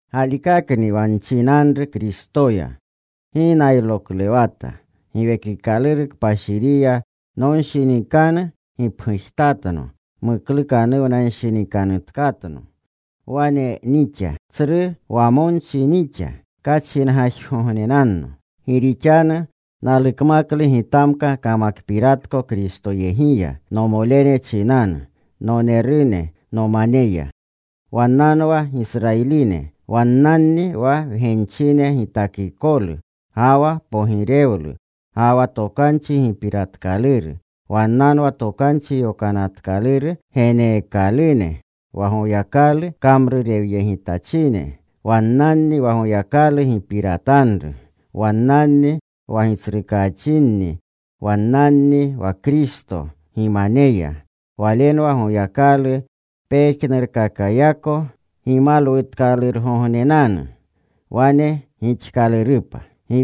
Galikakni wa nchinanru Kristoya. Gi nayroklewata. Giwekikaluru Kpashiriya nonshinikanu gipgujtatno muklukanuwnanshinikanutkatno. Wane nixa, tsru wamonchi nixa. Kachingajgognenanno. Gi rixanu nalukmaklu gitakmaka kamakpiratko Kristoyegiya nomolene chinanu, nonerune nomaneya. Wannanwa Gisrayiline. Wannanni wa wgenchine gitakikolu, ga wa pogirewlu, ga wa tokanchi gipiratkaluru. Wannanwa Tokanchi Yokanatkaluru geneekalune, wa Goyakalu kamrurewyegitachine. Wannanni wa Goyakalu gipiratanru. Wannanni wa gitsrukachinni. Wannanni wa Kristo gimaneya. Walenwa Goyakalu pejnurkakayako gimalwutkalurgognenanu. Wane gixkalurupa.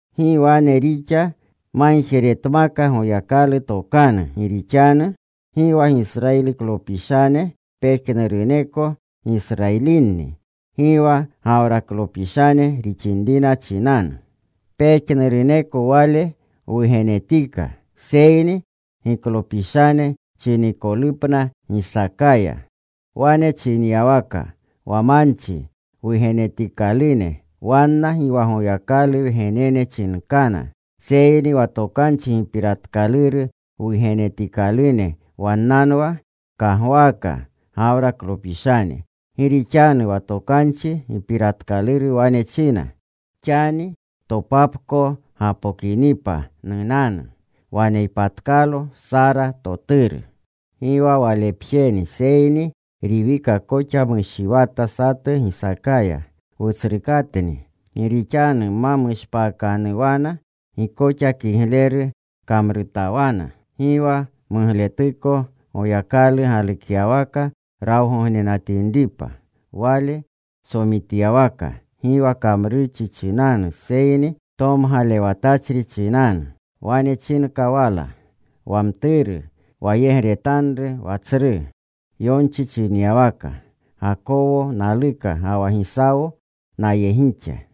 Gi wane rixa magjeretmaka Goyakalu tokanu. Gi rixanu gi wa Gisrayiliklopishane pejnuruneko Gisrayilinni. Gi wa Gawraklopishane rixinrina chinanu, pejnuruneko wale wugenetika. Seyni giklopishane chinikolupna Gisaakaya. Wane chinyawaka, wa manchi wugenetikalune, wanna gi wa Goyakalu wgenene chinkana, seyni wa tokanchi gipiratkaluru wugenetikalune wannanwa kagwaaka Gawraklopishane. Gi rixanu wa tokanchi gipiratkaluru wane china: “Xani topapko gapokinipa, nunanu. Waneypatkalo Sara toturu.” Gi wa walepjeni, seyni Riwika koxa mushiwata satu Gisaakaya, wutsrukatni. Gi rixanu ma mushpaakanuwana, gi koxa kigleru kamrutawana, gi wa mugletuko, Goyakalu galukyawaka rawgognenatinripa, Wale tsomityawaka, gi wa kamrurchi chinanu, seyni tomgalewatachri chinanu, wane chinka wala, “Wa mturu wayegretanru wa tsru.” Yonchi chinyawaka: Gakowo naluka, ga wa Gisawo nayegixa.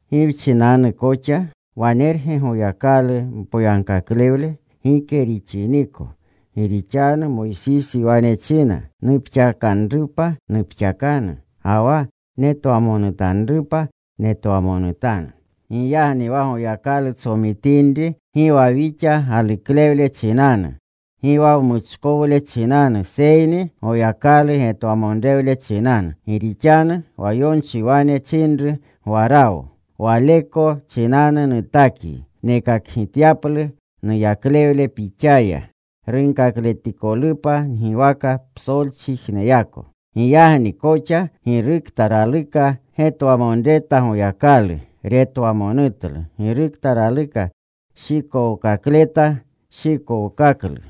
¿Gi wchinanu koxa? ¿Wanerge Goyakalu mpoyagkaklewle? Gike rixiniko. Gi rixanu Moysisi wane china: Nupxakanrupa nupxakanu, ga wa netwamonutanrupa netwamonutanu. Giyagni wa Goyakalu tsomitinri gi wa wixa galuklewle chinanu, gi wa wmuchkowle chinanu, seyni Goyakalu getwamonrewle chinanu. Gi rixanu wa yonchi wane chinru Gwarawo: Waleko chinanu nutakyi nekakgityaplu nuyaklewle pixaya, runkakletikolupa ngiwaka psolchijneyako. Giyagni koxa girukta raluka getwamonreta Goyakalu, retwamonutlu. Girukta raluka shikowkakleta, shikowkaklu.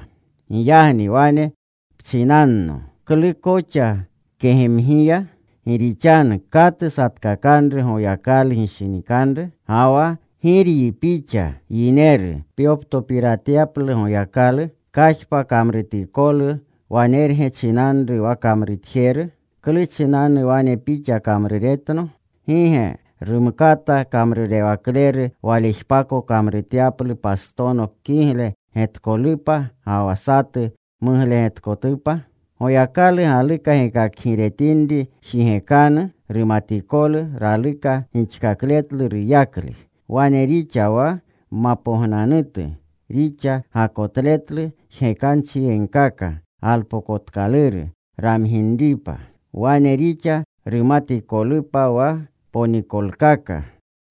Giyagni wane pchinanno, “¿Klu koxa kegemgiya?” Gi rixanu ¿katu satkakakanru Goyakalu gishinikanru? Ga wa ¿giryi pixa yineru pyoptopiratyaplu Goyakalu? ¿Kajpa kamrutikolu wanerge chinanru wa kamrutjeru,? “¿Klu chinanu wane pixa kamruretno?” ¿Gi ge rumkata kamrurewakleru walejpako kamrutyaplu pastono kigle getkolupa ga wa satu muglegetkotupa? Goyakalu galuka gekakgiretinri jigekanu, rumatikolu raluka gixkakletlu ruyakle, wane rixa wa mapognanutu rixa gakotletlu jgekanchiyegkaka galpokotkaluru ramginripa. Wane rixa rumatikolupa wa ponikolkaka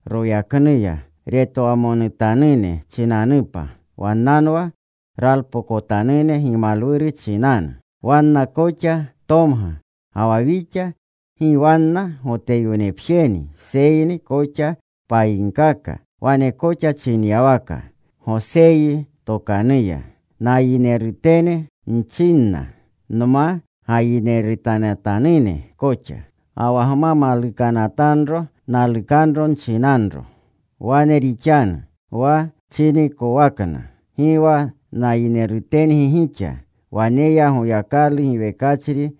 royaknuya retwamonutanune chinanupa. Wannanwa ralpokotanune gimalwuru chinanu. Wanna koxa tomga, ga wa wixa. Gi wanna Goteyonepjeni, seyni koxa payinkaka. Wane koxa chinyawaka Goseyi tokanuya: Nayinerutene nchinanna nma gayinerutetanatanune koxa. Ga wa nma malukanatanro, nalukanro nchinanro. Wane rixanu: Wa chinikowakna: Gi wa nayinerutengi gixa, Waneya Goyakalu giwekachri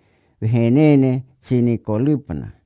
wgenene chinikolupna.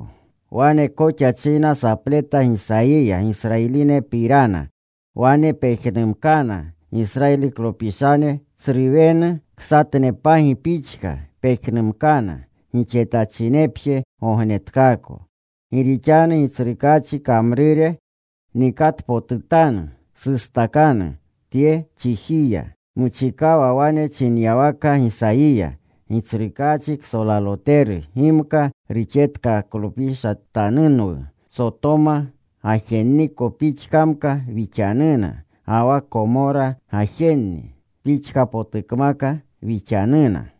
Wane koxa china sapleta Gisayiya Gisrayilinepirana: “Wane pejnumkana Gisrayiliklopishane tsru wenu ksatnepagi pixka pejnumkana, gixetachinepje gognetkaako.” Gi rixanu Gitsrukaachi kamrure nikatpotutanu, sustakanu tye chijiya. Muchikawa wane chinyawaka Gisayiya: Gitsrukaachi ksolaloteru gimka ruxetkaklopishatanunwu, Sotoma gajenniko pixkamka wixanuna, ga wa Komora gajenni pixkapotukmaka wixanuna.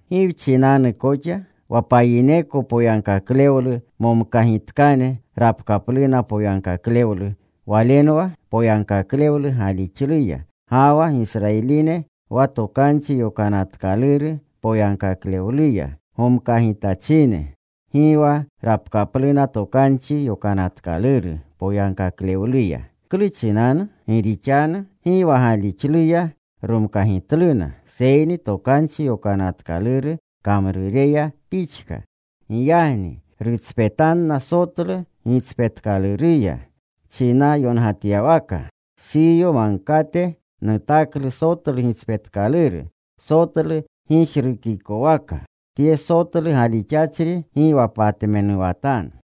¿Gi wchinanu koxa? Wa payineko poyagkaklewlu momkagitkane rapkapluna poyagkaklewlu. Walenwa poyagkaklewlu galixluya. Ga wa Gisrayiline wa Tokanchi Yokanatkaluru poyagkaklewluya gomkagitachine, gi wa rapkapluna Tokanchi Yokanatkaluru poyagkaklewluya. ¿Klu chinanu? Gi rixanu gi wa galixluya romkagitluna, seyni Tokanchi Yokanatkaluru kamrureya pixka. Giyagni rutspetanna sotlu gitspetkaluruya. Chinyongatyawaka: Siyo Magkate nutaklu sotlu gitspetkaluru, sotlu gijrukikowaka, Tye sotlu galixachri gi wa patmenuwatanu.